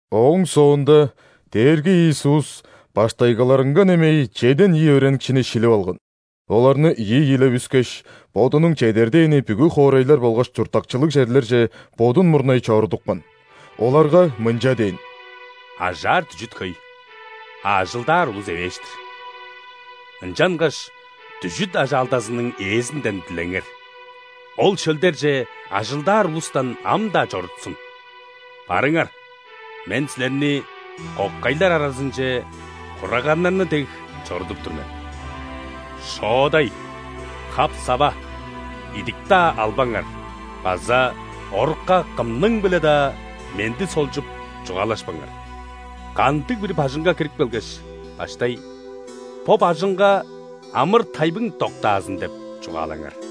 Ооң соонда Дээрги Иисус баштайгыларынга немей чеден ийи өөреникчини шилип алган. Оларны ийи-ийилеп үскеш, Бодунуң чедер дээни бүгү хоорайлар болгаш чурттакчылыг черлерже Бодун мурнай чорудупкан. Оларга мынча дээн: «Ажаар дүжүт хөй, а ажылдаар улус эвээш-тир. Ынчангаш дүжүт ажаалдазының Ээзинден дилеңер: Ол шөлдерже ажылдаар улустан ам-даа чорутсун. Барыңар! Мен силерни кокайлар аразынче хураганнарны дег чорудуп тур мен. Шоодай, хап-сава, идик-даа албаңар база орукка кымның-биле-даа менди солчуп, чугаалашпаңар. Кандыг-бир бажыңга кирип келгеш, баштай: „Бо бажыңга амыр-тайбың доктаазын!“ – деп чугаалаңар.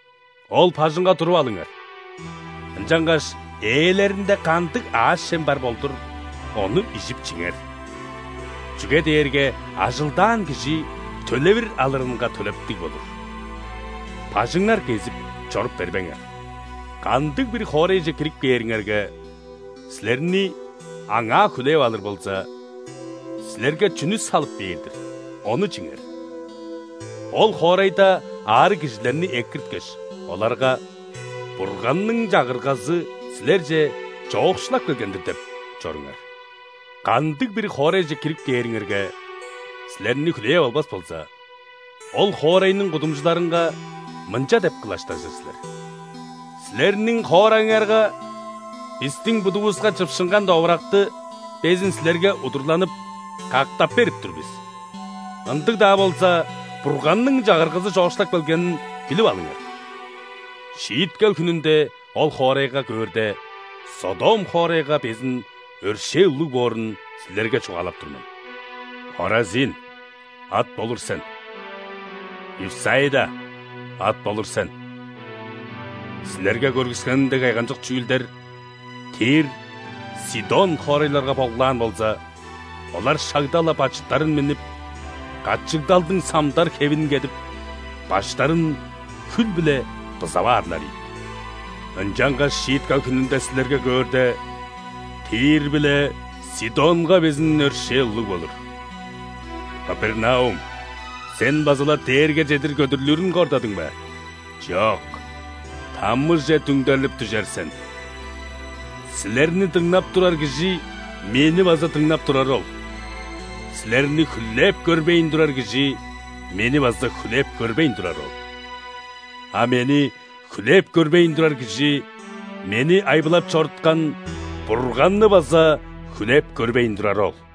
Ол бажыңга туруп алыңар, ынчангаш ээлеринде кандыг аъш-чем бар болдур, ону ижип-чиңер, чүге дээрге ажылдаан кижи төлевир алырынга төлептиг болур. Бажыңнар кезип чоруп бербеңер. Кандыг-бир хоорайже кирип кээриңерге, силерни аңаа хүлээп алыр болза, силерге чүнү салып бээр-дир, ону чиңер. Ол хоорайда аарыг кижилерни экирткеш, оларга: „Бурганның Чагыргазы силерже чоокшулап келген-дир!“ – деп чоруңар. Кандыг-бир хоорайже кирип кээриңерге, силерни хүлээп албас болза, ол хоорайның кудумчуларынга мынча деп кылаштажыр силер: „Силерниң хоорайыңарга бистиң будувуска чыпшынган довуракты безин силерге удурланып, кактап берип тур бис. Ындыг-даа болза, Бурганның Чагыргазы чоокшулап келгенин билип алыңар!“ Шииткел хүнүнде ол хоорайга көөрде, Содом хоорайга безин өршээл улуг боорун силерге чугаалап тур мен». «Хоразин, ат болур сен! Вифсаида, ат болур сен! Силерге көргүскеним дег кайгамчык чүүлдер Тир, Сидон хоорайларга болгулаан болза, олар шагда-ла бачыттарын миннип, качыгдалдың самдар хевин кедип, баштарын хүл-биле бызап аарлар ийик. Ынчангаш шииткел хүнүнде силерге көөрде, Тир биле Сидонга безин өршээл улуг болур. Капернаум, сен база-ла дээрге чедир көдүрлүрүн кордадың бе? Чок, ·тамыже дүңдерлип дүжер сен! Силерни дыңнап турар кижи Мени база дыңнап турары ол, силерни хүлээп көрбейн турар кижи Мени база хүлээп көрбейн турары ол, а Мени хүлээп көрбейн турар кижи Мени айбылап чоруткан Бурганны база хүлээп көрбейн турары ол».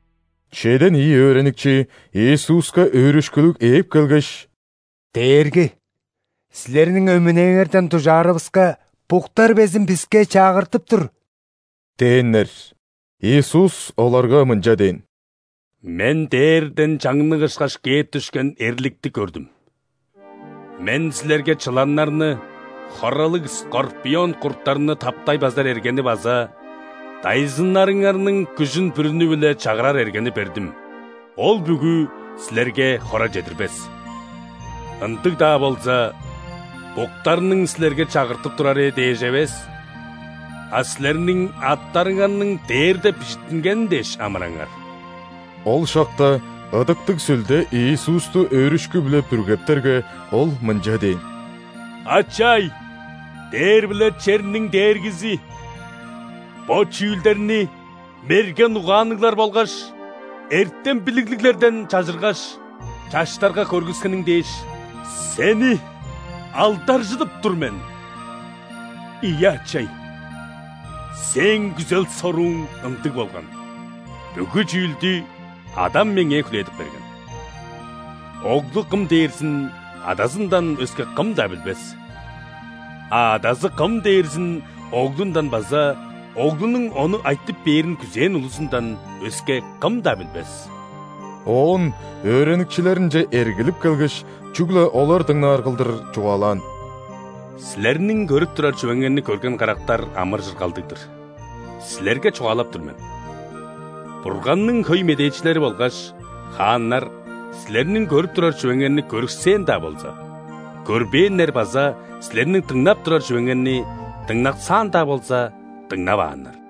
Чеден ийиR өөреникчи Иисуска өөрүшкүлүг ээп келгеш: «Дээрги! Силерниң өмүнээңерден дужаарывыска, буктар безин биске чагыртып тур» – дээннер. Иисус оларга мынча дээн: «Мен дээрден чаңнык ышкаш кээп дүшкен эрликти көрдүм. Мен силерге чыланнарны, хоралыг скорпион курттарны таптай базар эргени база дайзыныңарның күжүн бүрүнү-биле чагырар эргени бердим, ол бүгү силерге хора чедирбес. Ындыг-даа болза, буктарның силерге чагыртып турары дээш эвес, а силерниң аттарыңарның дээрде бижиттингени дээш амыраңар». Ол шакта Ыдыктыг Сүлде Иисусту өөрүшкү-биле бүргептерге, Ол мынча дээн: «Ачай, дээр биле черниң Дээргизи! Бо чүүлдерни мерген угаанныглар болгаш эртем-билиглиглерден чажыргаш, чаштарга көргүскениң дээш, Сени алдаржыдып тур мен! Ийе, Ачай, Сээң күзел-сорууң ындыг болган. Бүгү чүүлдү Адам Меңээ хүлээдип берген. Оглу Кым дээрзин Адазындан өске кым-даа билбес, а Адазы Кым дээрзин Оглундан база Оглунуң ону айтып бээрин күзээн улузундан өске кым-даа билбес». Оон өөреникчилеринче эргилип келгеш, чүгле олар дыңнаар кылдыр чугаалаан: «Силерниң көрүп турар чүвеңерни көрген карактар амыр-чыргалдыг-дыр! Силерге чугаалап тур мен: Бурганның хөй медээчилери болгаш хааннар силерниң көрүп турар чүвеңерни көрүксээн-даа болза, көрбээннер база силерниң дыңнап турар чүвеңерни дыңнаксаан-даа болза, дыңнавааннар».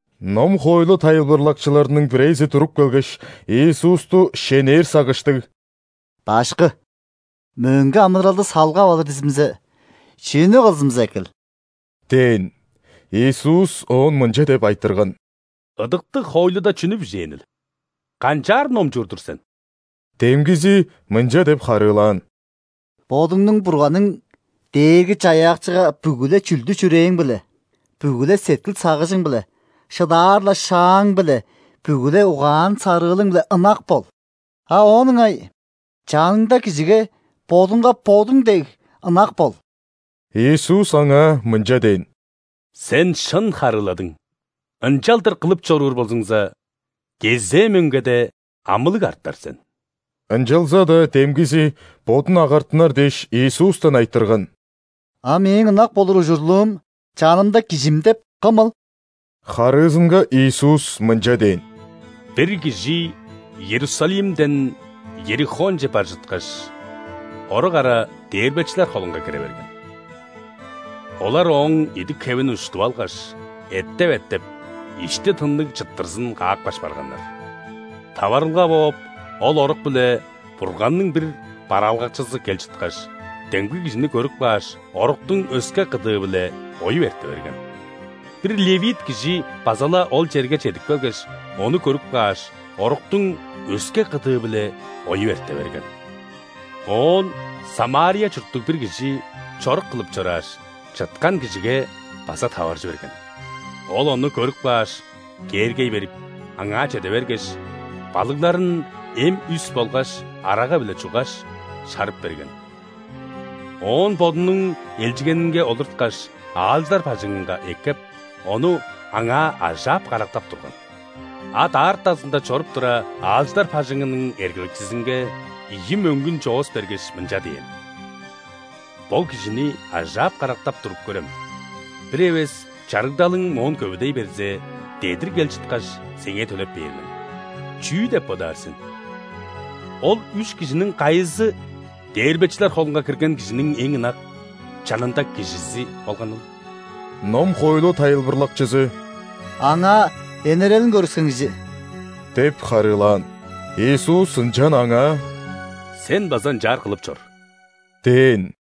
Ном-хоойлу тайылбырлакчыларының бирээзи туруп келгеш, Иисусту шенээр сагыштыг: «Башкы! Мөңге амыдыралды салгап алыр дизимзе, чүнү кылзымза экил?» – дээн. Иисус оон мынча деп айтырган: «Ыдыктыг хоойлуда чүнү бижээнил? Канчаар номчуур-дур сен?» Демгизи мынча деп харыылаан: «Бодуңнуң Бурганың Дээрги-Чаяакчыга бүгү-ле чүлдү-чүрээң-биле, бүгү-ле сеткил-сагыжың-биле, шыдаар-ла шааң-биле, бүгү-ле угаан-сарыылың-биле ынак бол», а оон ыңай: «Чаныңда кижиге бодуңга бодуң дег ынак бол». Иисус аңаа мынча дээн: «Сен шын харыыладың, ынчалдыр кылып чоруур болзуңза, кезээ мөңгеде амылыг артар сен». Ынчалза-даа демгизи, бодун агартынар дээш, Иисустан айтырган: «А мээң ынак болур ужурлуум чанымда кижим деп кымыл?» Харыызынга Иисус мынча дээн: «Бир кижи Иерусалимден Иерихонче бар чыткаш, орук ара дээрбечилер холунга кире берген. Олар ооң идик-хевин уштуп алгаш, эттеп-эттеп, ишти тынныг чыттырзын каапкаш барганнар. Таварылга бооп, ол орук-биле Бурганның бир бараалгакчызы кел чыткаш, демги кижини көрүп кааш, оруктуң өске кыдыы-биле оюп эрте берген. Бир ·левит кижи база-ла ол черге чедип келгеш, ону көрүп кааш, оруктуң өске кыдыы-биле оюп эрте берген. Оон ·Самария чурттуг бир кижи чорук кылып чорааш, чыткан кижиге база таваржы берген. Ол ону көрүп кааш, кээргей берип, аңаа чеде бергеш, балыгларын эм үс болгаш арага-биле чуггаш, шарып берген. Оон бодунуң элчигенинге олурткаш, аалчылар бажыңынга эккеп, ону аңаа ажаап-карактап турган. А даартазында чоруп тура, аалчылар бажыңының эргелекчизинге ийи мөңгүн чоос бергеш, мынча дээн: „Бо кижини ажаап-карактап туруп көрем, бир эвес чарыгдалың моон көвүдей берзе, дедир кел чыткаш, сеңээ төлеп бээр мен“. Чүү деп бодаар сен, ол үш кижиниң кайызы дээрбечилер холунга кирген кижиниң эң ынак, чанында кижизи болганыл?» Ном-хоойлу тайылбырлакчызы: «Аңаа энерелин көргүскен кижи» – деп харыылаан. Иисус ынчан аңаа: «Сен база ынчаар кылып чор» – дээн.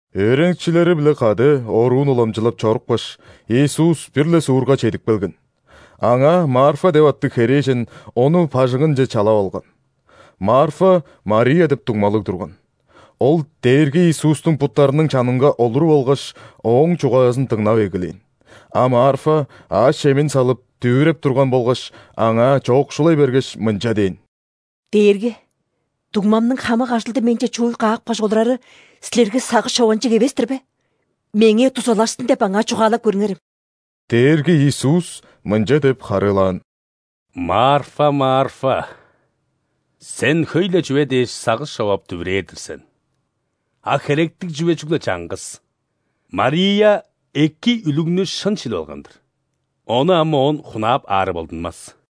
Өөреникчилери-биле кады оруун уламчылап чорупкаш, Иисус бир-ле суурга чедип келген. Аңаа Марфа деп аттыг херээжен Ону бажыңынче чалап алган. Марфа Мария деп дуңмалыг турган. Ол Дээрги Иисустуң буттарының чанынга олуруп алгаш, Ооң чугаазын дыңнап эгелээн. А Марфа аъш-чемин салып, дүвүреп турган болгаш, Аңаа чоокшулай бергеш, мынча дээн: «Дээрги! Дуңмамның хамык ажылды менче чууй каапкаш олурары Силерге сагыш чованчыг эвес-тир бе? Меңээ дузалашсын деп аңаа чугаалап көрүңерем». Дээрги Иисус мынча деп харыылаан: «Марфа, Марфа! Сен хөй-ле чүве дээш сагыш човап, дүвүрээр-дир сен. А херектиг чүве чүгле чаңгыс. Мария эки үлүгнү шын шилип алган-дыр, ону ам оон хунаап аары болдунмас».